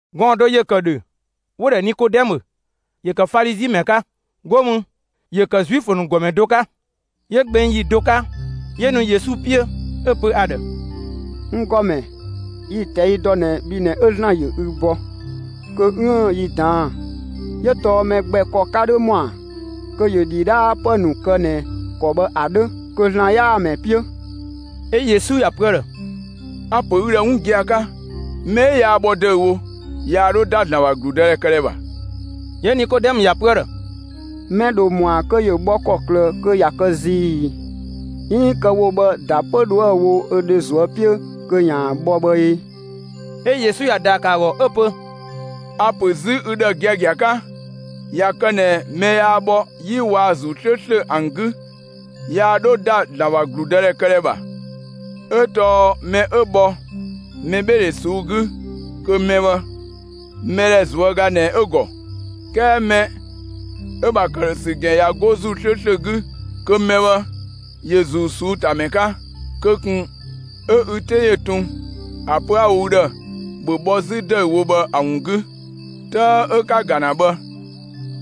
Gɔɔn‑ do ‑yö ‑kë ‑dhö, 'wo‑ ‑dhɛ Nikodɛmö; ‑yö ‑kë Falizi ‑mɛ 'ka, 'go mü, ‑yö ‑kë Zuifö ‑nu ‑gɔmɛ do 'ka. 'Yö gbeng ‑yi do 'ka, 'yö nu Yesu 'piö 'ö‑ pö ‑a ‑dhë: «N ‑Gɔmɛ, yi‑ ꞊tɛi' ‑dɔ ꞊nɛ bhi ꞊nɛ 'ö ‑Zlan ‑yö ü bɔ kö 'üën‑ yi ꞊daan'‑; 'yö tɔɔ mɛ gbɛ ‑kɔ 'ka 'dhö ‑mɔa kö ‑yö ‑dhidhaapë ‑nu kë ꞊nɛ ‑kɔ bhë ‑a 'dhö kö ‑Zlan 'yaa‑ ‑mɛ 'piö.» 'Ö Yesu ‑ya pö ‑a ‑dhë: «A‑ ‑pö ü ‑dhë 'wun gia‑ 'ka, mɛ 'ö yaa bhɔ ‑dëüwo, yaa 'dhö ‑da ‑Zlan ‑bha ‑gludëdhɛ këdhɛ ‑bha.» 'Yö Nikodɛmö ‑ya pö ‑a ‑dhë: «Mɛ ‑dho ‑mɔa kö ‑yö bhɔ ‑kɔklë kö ꞊ya kë zii ‑ii, 'iin kë‑ wo bhë ‑da 'pö 'dhoë‑ wo 'zü ö dhe ꞊zuö' 'piö kö ‑yaan bhɔ bhë ee?» 'Ö Yesu ‑ya ‑daa ‑kë ‑a ‑gɔ 'ö‑ pö: «A‑ ‑pö 'zü ü ‑dhë giagia 'ka, ꞊ya kë ꞊nɛ mɛ yaa bhɔ 'yi waa‑ ‑Zuu 'slööslö ‑an 'gü, yaa 'dhö ‑da ‑Zlan ‑bha ‑gludëdhɛ këdhɛ ‑bha. 'Ö tɔɔ mɛ 'ö bhɔ mɛbheedhe ꞊suu'‑ 'gü, kö mɛ bhë, mɛdhɛ ꞊zuöga ꞊nɛ 'ö‑ ‑gɔ; 'kɛɛ mɛ 'ö‑ ‑bha ‑këdhösü ‑gɛn ꞊ya 'go ‑Zuu 'slööslö 'gü, kö mɛ bhë ‑yö ‑Zuu ꞊suu'‑ ‑ta ‑mɛ 'ka. Kö ꞊kun 'ö ü 'te ‑yö tun ‑a pö 'a‑ wo ü ‑dhë: ‑Bhö bhɔ 'zü ‑dëüwo bhë ‑a ‑wun 'gü. 'Tëë 'ö 'ka‑ ‑ga ‑na bhë,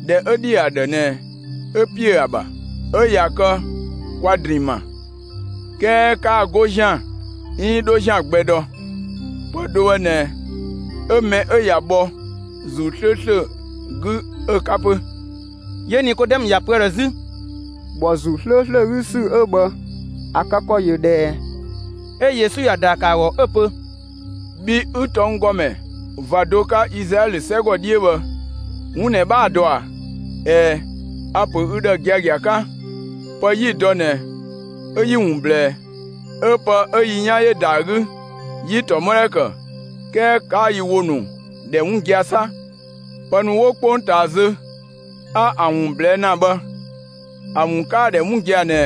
꞊dhɛ 'ö ‑dhi ‑a ‑dhë ꞊nɛ 'ö ‑piö ‑a ‑bha, 'ö ꞊ya kë kwa‑ ‑drinng ma. 'Kɛɛ 'kaa‑ 'go ‑zian 'iin 'dho ‑zian gbɛ dɔ. Pë do bhë ꞊nɛ 'ö mɛ 'ö ꞊ya bhɔ ‑Zuu 'slööslö 'gü 'ö‑ 'ka 'pö.» 'Yö Nikodɛmö ‑ya pö ‑a ‑dhë 'zü: «‑Bhɔ ‑Zuu 'slööslö 'gü ‑sü 'ö bhë, ‑a kë ‑kɔ ‑yö ꞊dhë ꞊ɛ?» 'Ö Yesu ‑ya ‑daa ‑kë ‑a ‑gɔ 'ö‑ pö: «Bhi 'ü tɔnggɔmɛ ꞊va do 'ka Izlaɛlö 'sɛgɔ 'dhiö bhë, 'wun ꞊nɛ 'bhaa‑ dɔ ꞊a? ꞊Ɛɛ, a‑ ‑pö ü ‑dhë giagia 'ka: Pë 'yi‑ dɔ ꞊nɛ 'ö 'yi‑ ‑wun ꞊blɛɛ; 'ö pë 'ö yi 'yan ‑yö ‑da ‑a 'gü 'yi‑ ‑tɔmɔdhɛ ‑kë; 'kɛɛ 'kaa yi ‑wo ‑nu ‑dhɛ 'wun gia‑ 'sa! Pë ‑nu 'wo 'kpongtaa zö 'a ‑an ‑wun ꞊blɛɛ' ‑na bhë, ‑a ‑wun 'kaa‑ ‑dhɛ 'wun gia‑ ꞊nɛ,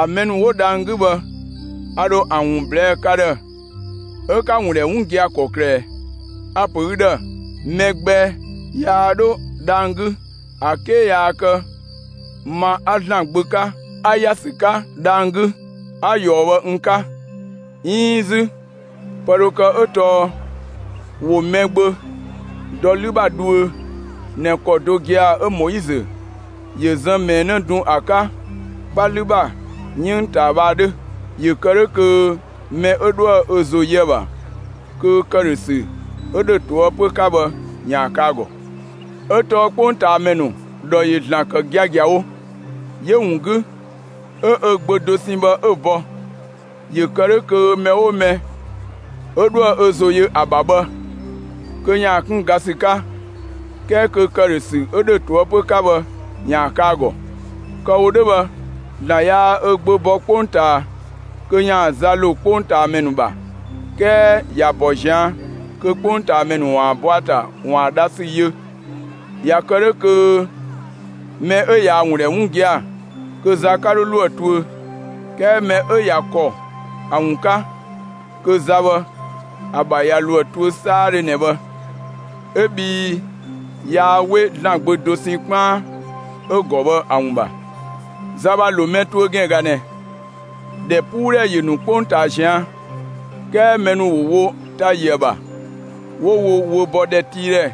‑a mɛ ‑nu 'wo dhang‑ 'gü bhë, a ‑dho ‑a ‑wun ꞊blɛɛ' ka ‑dhë 'ö 'ka‑ ‑wun ‑dhɛ 'wun gia‑ ‑kɔklë ꞊ɛɛ? A‑ ‑pö ü ‑dhë, mɛ gbɛ yaa 'dho dhang‑ 'gü, ‑a 'ke yaa kë ma 'a ‑Zlan Gbö 'ka, 'a ‑ya ‑sü 'ka dhang‑ 'gü, 'a ꞊yɔɔ bhë n 'ka. 'Iin 'zü pë dho kë 'ö tɔɔ ‑wo Mɛgbö dɔ 'lü ‑bha dhuö ꞊nɛ ‑kɔ do gia‑ 'ö Moizö ‑yö zën ꞊mɛɛ 'në dun ‑a 'ka 'kpa 'lü ‑bha 'yënng ꞊taa bhë ‑a 'dhö. ‑Yö kë 'dhö kö mɛ 'ö 'dhoë‑ ö ‑zo yö ‑a ‑bha, kö ‑këdhösü 'ö 'dhö ꞊toëpö 'ka bhë ‑yaan kë ‑a ‑gɔ. 'Ö tɔɔ 'kpongtaamɛ ‑nu ‑dhɔ ‑yö ‑Zlan ‑kë giagiawo; 'yö‑ ‑wun 'gü 'ö ö Gbö dosɛn bhë 'ö‑ bɔ, ‑yö kë 'dhö kö mɛ 'oo mɛ 'ö 'dhoë‑ ö ‑zo yö ‑a ‑bha bhë, kö ‑yaan 'kun ga ‑sü 'ka; 'kɛɛ kö ‑këdhösü 'ö ‑dhö ꞊toëpö 'ka bhë ‑yaan kë ‑a ‑gɔ. Kë‑ wo 'dhö bhë ‑Zlan yaa ö Gbö bɔ 'kpongtaa kö ‑yaan za ‑lo 'kpongtaamɛ ‑nu ‑bha, 'kɛɛ ‑ya ‑bɔ ꞊zian' kö 'kpongtaamɛ ‑nu ‑waan bɔ ‑a ‑ta ‑waan dha ‑sü yö. ꞊Ya kë 'dhö kö mɛ 'ö ꞊yaa‑ ‑wun ‑dhɛ 'wun gia‑ kö za 'ka 'dhö ‑lo ‑a tuö; 'kɛɛ mɛ 'ö ꞊ya ‑kɔ ‑a ‑wun 'ka, kö za bhë, ‑a ‑bha ꞊ya ‑lo ‑a tuö 'saadhö ꞊nɛ bhë. 'Ö bhii yaa 'we ‑Zlan Gbö dosɛn 'kpaan 'ö‑ ‑gɔ bhë ‑a ‑wun ‑bha. Za ‑bha ‑lo mɛ tuö ‑gɛn ꞊ga ꞊nɛ: ‑Dhɛpuudhɛ ‑yö ‑nu 'kpongtaa ꞊zian', 'kɛɛ mɛ ‑nu ‑wo wo ‑ta ‑yö ‑a ‑bha, 'wo wo wö bɔ ‑dhɛtiidhɛ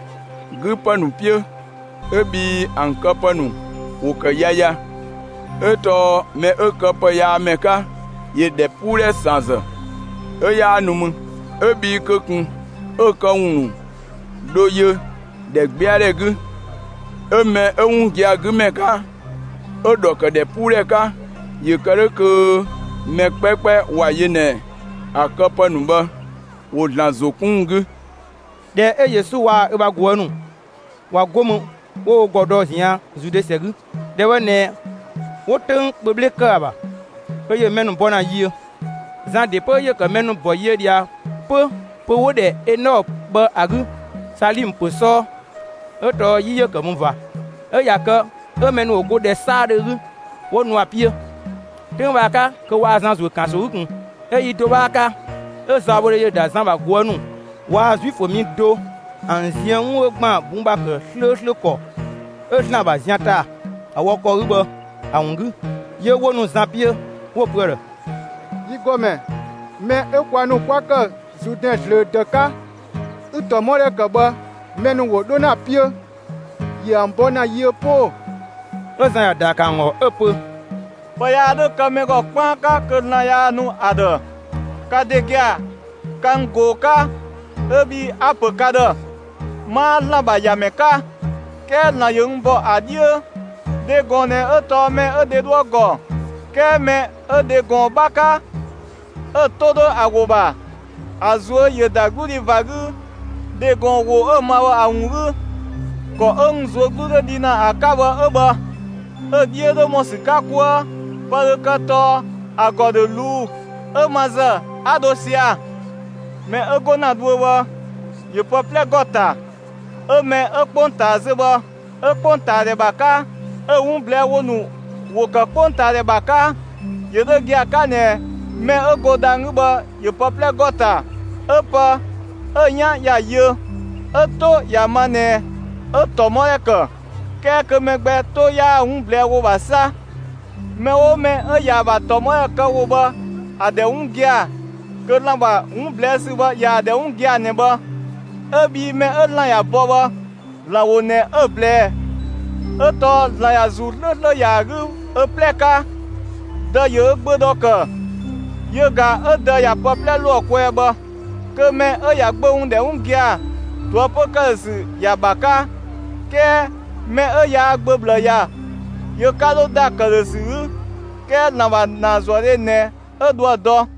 'gü ‑pë ‑nu 'piö 'ö bhii ‑an këpë ‑nu ‑wo ‑kë yaya. 'Ö tɔɔ mɛ 'ö këpëyaamɛ 'ka, ‑yö ‑dhɛpuudhɛ ‑san ‑zë 'ö 'yaa nu mü, 'ö bhii kö ꞊kun 'ö‑ këwun ‑nu dhö yö ‑dhɛgbɛadhɛ 'gü. 'Ö mɛ 'ö 'wun gia‑ 'gü ‑mɛ 'ka 'ö‑ ‑dhɔ ‑kë ‑dhɛpuudhɛ 'ka ‑yö kë 'dhö kö mɛ 'kpɛkpɛ ‑wa yö ꞊nɛ ‑a këpë ‑nu bhë ‑wo ‑Zlan ‑zo 'kun ‑wun 'gü.» ꞊Dhɛ 'ö Yesu waa‑ ö ‑bha ꞊guë' ‑nu ꞊wa 'go mü, ‑wo wo ‑gɔ dɔ ꞊zian' Zude ‑sɛ 'gü. ‑Dhɛ bhë ꞊nɛ 'wo 'töng kpö 'bhle ‑kë ‑a ‑bha, kö ‑yö mɛ ‑nu bɔ ‑na yiö. Zan ‑de 'pö ‑yö ‑kë mɛ ‑nu bɔ yiö ꞊dhia 'pö pö‑ 'wo‑ ‑dhɛ Enɔɔ bhë ‑a 'gü Salimë ‑pö 'sɔɔ, 'ö tɔɔ 'yi ‑yö ‑kë mü ꞊va. 'Ö ꞊ya kë 'ö mɛ ‑nu ‑wo go ‑dhɛ 'saadhö 'gü, 'wo nu ‑a 'piö. 'Töng bhë ‑a 'ka, kö waa Zan ‑zuö ‑kanso 'gü ꞊kun. 'Yö yi do 'bhaa 'ka 'ö zaɔbhodhe ‑yö ‑da Zan ‑bha ꞊guë' ‑nu waa‑ Zuifö mi do ‑an ziën 'wun 'ö ‑gban bun ‑bha ‑kë 'slööslö ‑kɔ 'ö ‑Zlan ‑bha zian ‑ta, ‑a wɔ ‑kɔ 'gü bhë ‑a ‑wun 'gü. 'Yö 'wo nu Zan 'piö, 'wo‑ pö ‑a ‑dhë: «Yi ‑Gɔmɛ, mɛ 'ö kwa ‑nu 'kwa‑ ‑kë Zuudɛn zlöö ‑dëü 'ka, 'ü‑ ‑tɔmɔdhɛ ‑kë bhë, mɛ ‑nu ‑wo 'dho ‑na ‑a 'piö, ‑yö ‑an bɔ ‑na yiö 'pö ‑oo!» 'Ö Zan ‑ya ‑daa ‑kë ‑an ‑gɔ 'ö‑ pö: «Pë yaa 'dhö kë mɛ ‑gɔ 'kpaan 'ka kö ‑Zlan yaa‑ nu ‑a ‑dhë. Ka ‑de gia‑, ka n ꞊goo‑ 'ka, 'ö bhii a‑ ‑pö ka ‑dhë: 'Maa ‑Zlan ‑bha ‑Yamɛ 'ka, 'kɛɛ ‑Zlan ‑yö n ‑bɔ ‑a 'dhiö. Dhe ‑gɔn ꞊nɛ 'ö tɔɔ mɛ 'ö dhe 'dhoë‑ ‑gɔ, 'kɛɛ mɛ 'ö dhe ‑gɔn 'bha 'ka, 'ö‑ 'to 'dhö ‑a ‑wo ‑bha, ‑a ꞊zuö' ‑yö ‑da 'gludhi ꞊va 'gü dhe ‑gɔn ‑wo 'ö‑ ma bhë ‑a ‑wun 'gü. ‑Kɔ 'ö n ꞊zuö' 'glu 'dhö dhi ‑na ‑a 'ka bhë 'ö bhë; 'ö‑ 'dhiö 'dhö ‑mɔ ‑sü 'ka 'kuë. Pë dho kë tɔɔ ‑a ‑gɔ ‑dho ꞊luu 'ö ma ‑zë 'a dho sia‑. Mɛ 'ö 'go ‑na dhuö bhë, ‑yö pë 'plɛ ‑gɔ ‑ta; 'ö mɛ 'ö 'kpongtaa zö bhë, 'ö 'kpongtaadhɛ ‑bha 'ka 'ö‑ 'wun ꞊blɛɛ ‑wo ‑nu ‑wo ‑kë 'kpongtaadhɛ ‑bha 'ka. ‑Yö 'dhö gia‑ 'ka ꞊nɛ mɛ 'ö go dhang‑ 'gü bhë, ‑yö pë 'plɛ ‑gɔ ‑ta, 'ö pë 'ö 'yan ‑ya yö 'ö‑ 'to ‑ya ma ꞊nɛ, 'ö‑ ‑tɔmɔdhɛ ‑kë; 'kɛɛ kö mɛ gbɛ 'to 'yaa‑ 'wun ꞊blɛɛ' ‑wo ‑bha 'sa. Mɛ 'oo mɛ 'ö ꞊yaa‑ ‑bha ‑tɔmɔdhɛ kë ‑wo bhë ‑a ‑dhɛ 'wun gia‑ kö ‑Zlan ‑bha 'wun ꞊blɛɛ' ‑sü bhë, ꞊yaa‑ ‑dhɛ 'wun gia‑ ꞊nɛ bhë; 'ö bhii mɛ 'ö ‑Zlan ‑ya bɔ bhë, ‑Zlan ‑wo ꞊nɛ 'ö‑ ꞊blɛɛ 'ö tɔɔ ‑Zlan ꞊ya ‑Zuu 'slööslö ‑ya ‑a 'gü ö 'plɛ 'ka. Dë ‑yö ö Gbö ‑dhɔ ‑kë, yö ꞊ga 'ö Dë ꞊ya pë 'plɛ ‑lo ‑a kwɛɛ bhë. Kö mɛ 'ö ‑ya Gbö ‑wun ‑dhɛ 'wun gia‑, ꞊toëpö ‑këdhösü ‑ya ‑bha 'ka. 'Kɛɛ mɛ 'ö yaa Gbö ꞊bhlë ‑ya, yö 'ka 'dhö ‑da ‑këdhösü 'gü, 'kɛɛ ‑Zlan ‑bha ‑naazuëdhe ꞊nɛ 'ö dhoë‑ dɔ.»